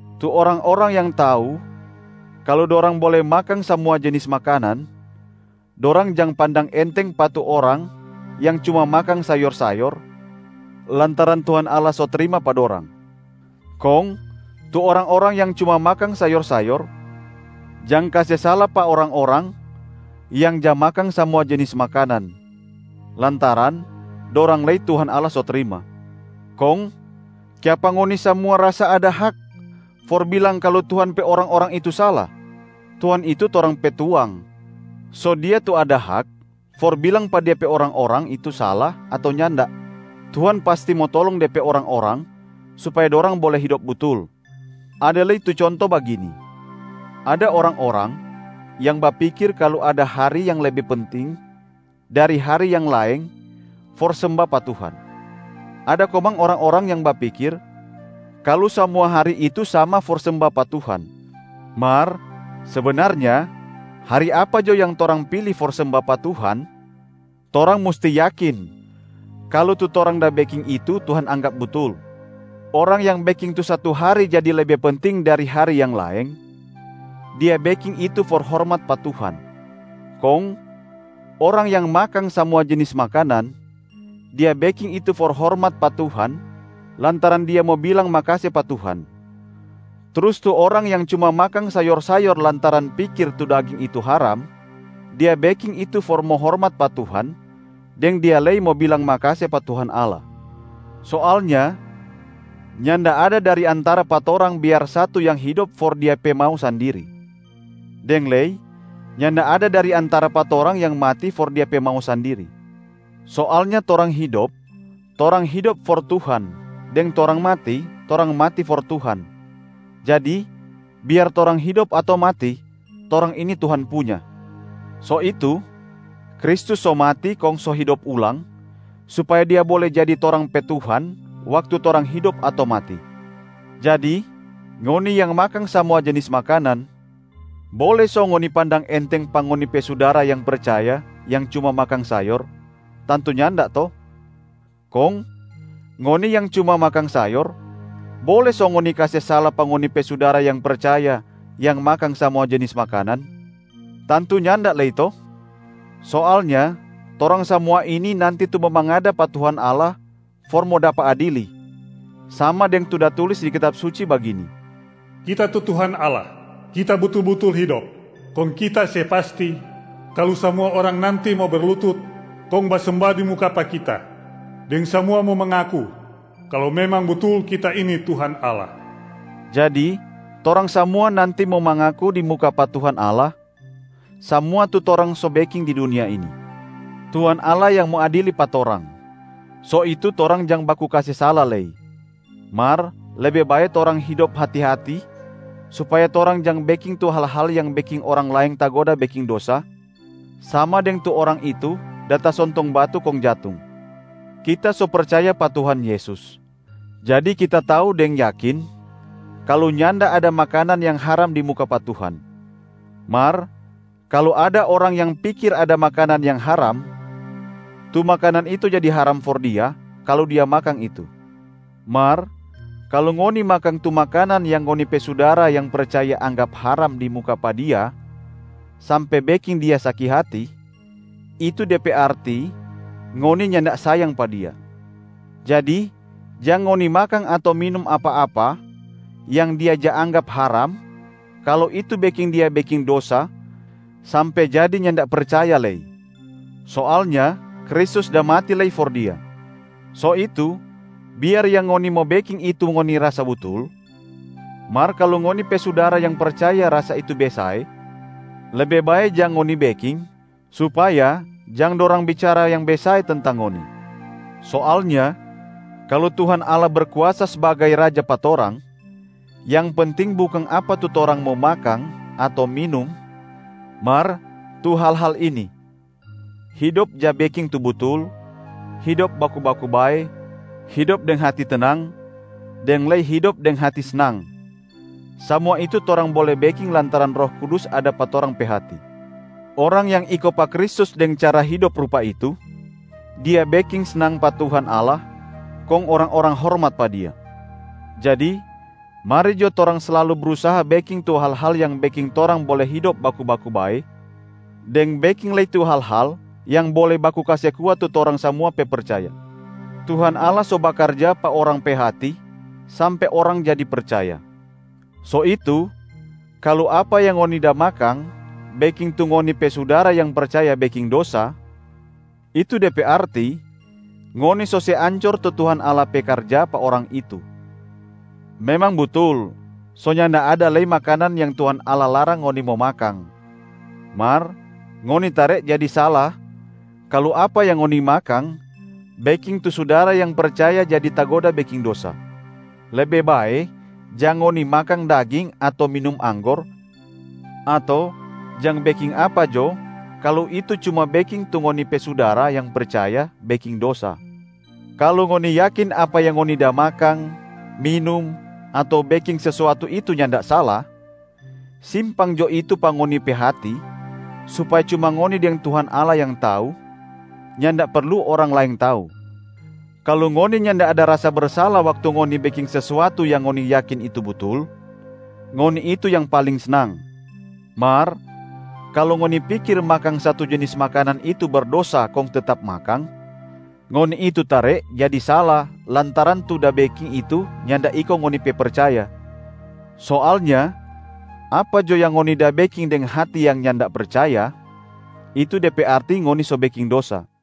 Tu orang-orang yang tau kalu dorang bole makang samua jenis makanan, dorang jang pandang enteng pa tu orang yang cuma makang sayor-sayor, lantaran Tuhan Allah so trima pa dorang. Kong tu orang-orang yang cuma makang sayor-sayor jang kase sala pa orang-orang yang ja makang samua jenis makanan, lantaran dorang lei Tuhan Allah so trima. Kong kiapa ngoni samua rasa ada hak for bilang kalu Tuhan pe orang-orang itu sala? Tuhan itu torang pe Tuang, so Dia tu ada hak for bilang pa De pe orang-orang itu sala ato nyanda. Tuhan pasti mo tolong De pe orang-orang supaya dorang bole hidop butul. Ada lei tu conto bagini: ada orang-orang yang bapikir kalu ada hari yang lebe penting dari hari yang laeng for semba pa Tuhan. Ada komang orang-orang yang bapikir kalu samua hari itu sama for semba pa Tuhan. Mar sebenarnya hari apa jo yang torang pili for semba pa Tuhan, torang musti yakin kalu tu torang da beking itu Tuhan anggap butul. Orang yang beking tu satu hari jadi lebe penting dari hari yang laeng, dia beking itu for hormat pa Tuhan. Kong orang yang makang samua jenis makanan, dia beking itu for hormat pa Tuhan lantaran dia mo bilang makase pa Tuhan. Trus tu orang yang cuma makang sayor-sayor lantaran pikir tu daging itu haram, dia beking itu for mo hormat pa Tuhan, deng dia lei mo bilang makase pa Tuhan Allah. Soalnya nyanda ada dari antara pa torang biar satu yang hidop for dia pe mau sandiri. Deng lei, nyanda ada dari antara pa torang yang mati for dia pe mau sandiri. Soalnya torang hidop, torang hidop for Tuhan, deng torang mati, torang mati for Tuhan. Jadi biar torang hidop ato mati, torang ini Tuhan punya. So itu, Kristus so mati kong so hidop ulang supaya Dia bole jadi torang pe Tuhan waktu torang hidop ato mati. Jadi ngoni yang makang samua jenis makanan, bole so ngoni pandang enteng pa ngoni pe sudara yang percaya yang cuma makang sayor? Tantu nyanda to? Kong ngoni yang cuma makang sayor, bole so ngoni kase sala pa ngoni pe sudara yang percaya yang makang samua jenis makanan? Tantu nyanda lei to? Soalnya torang samua ini nanti tu mo mangada pa Tuhan Allah for mo dapa adili. Sama deng tu da tulis di Kitab Suci bagini, “Kita tu Tuhan Allah, Kita butul-butul hidop, kong Kita se pasti kalu samua orang nanti mo berlutut kong basemba di muka pa Kita, deng samua mo mangaku kalu memang butul Kita ini Tuhan Allah.” Jadi torang samua nanti mo mangaku di muka pa Tuhan Allah samua tu torang so beking di dunia ini. Tuhan Allah yang mo adili pa torang, so itu torang jang baku kase sala lei. Mar lebe bae torang hidop hati-hati supaya torang jang beking tu hal-hal yang beking orang laeng tagoda beking dosa, sama deng tu orang itu da tasontong batu kong jatung. Kita so percaya pa Tuhan Yesus, jadi kita tau deng yakin kalu nyanda ada makanan yang haram di muka pa Tuhan. Mar kalu ada orang yang pikir ada makanan yang haram, tu makanan itu jadi haram for dia kalu dia makang itu. Mar kalu ngoni makang tu makanan yang ngoni pe sudara yang percaya anggap haram di muka pa dia sampe beking dia saki hati, itu de pe arti ngoni nyanda sayang pa dia. Jadi jang ngoni makang ato minum apa-apa yang dia ja anggap haram kalu itu beking dia beking dosa sampe jadi nyanda percaya lei. Soalnya Kristus da mati lei for dia. So itu, biar yang ngoni mo beking itu ngoni rasa butul, mar kalu ngoni pe sudara yang percaya rasa itu besae, lebe bae jang ngoni beking supaya jang dorang bicara yang besae tentang ngoni. Soalnya kalu Tuhan Allah berkuasa sbagai raja pa torang, yang penting bukang apa tu torang mo makang ato minum mar tu hal-hal ini: hidop ja beking tu butul, hidop baku-baku bae, hidop deng hati tenang, deng lei hidop deng hati snang. Samua itu torang bole beking lantaran Roh Kudus ada pa torang pe hati. Orang yang iko pa Kristus deng cara hidop rupa itu, dia beking snang pa Tuhan Allah kong orang-orang hormat pa dia. Jadi mari jo torang slalu brusaha beking tu hal-hal yang beking torang bole hidop baku-baku bae deng beking lei tu hal-hal yang bole baku kase kuat tu torang samua pe percaya. Tuhan Allah so bakarja pa orang pe hati sampe orang jadi percaya. So itu, kalu apa yang ngoni da makang beking tu ngoni pe sudara yang percaya beking dosa, itu de pe arti ngoni so se ancor tu Tuhan Allah pe karja pa orang itu. Memang butul so nyanda ada lei makanan yang Tuhan Allah larang ngoni mo makang, mar ngoni tare jadi sala kalu apa yang ngoni makang beking tu sudara yang percaya jadi tagoda beking dosa. Lebe bae jang ngoni makang daging ato minum anggor ato jang beking apa jo kalu itu cuma beking tu ngoni pe sudara yang percaya beking dosa. Kalu ngoni yakin apa yang ngoni da makang, minum ato beking sesuatu itu nyanda sala, simpang jo itu pa ngoni pe hati supaya cuma ngoni deng Tuhan Allah yang tau, nyanda perlu orang laeng tau. Kalu ngoni nyanda ada rasa bersala waktu ngoni beking sesuatu yang ngoni yakin itu butul, ngoni itu yang paling snang. Mar kalu ngoni pikir makang satu jenis makanan itu berdosa kong tetap makang, ngoni itu tare jadi sala lantaran tu da beking itu nyanda iko ngoni pe percaya. Soalnya apa jo yang ngoni da beking deng hati yang nyanda percaya, itu de pe arti ngoni so beking dosa.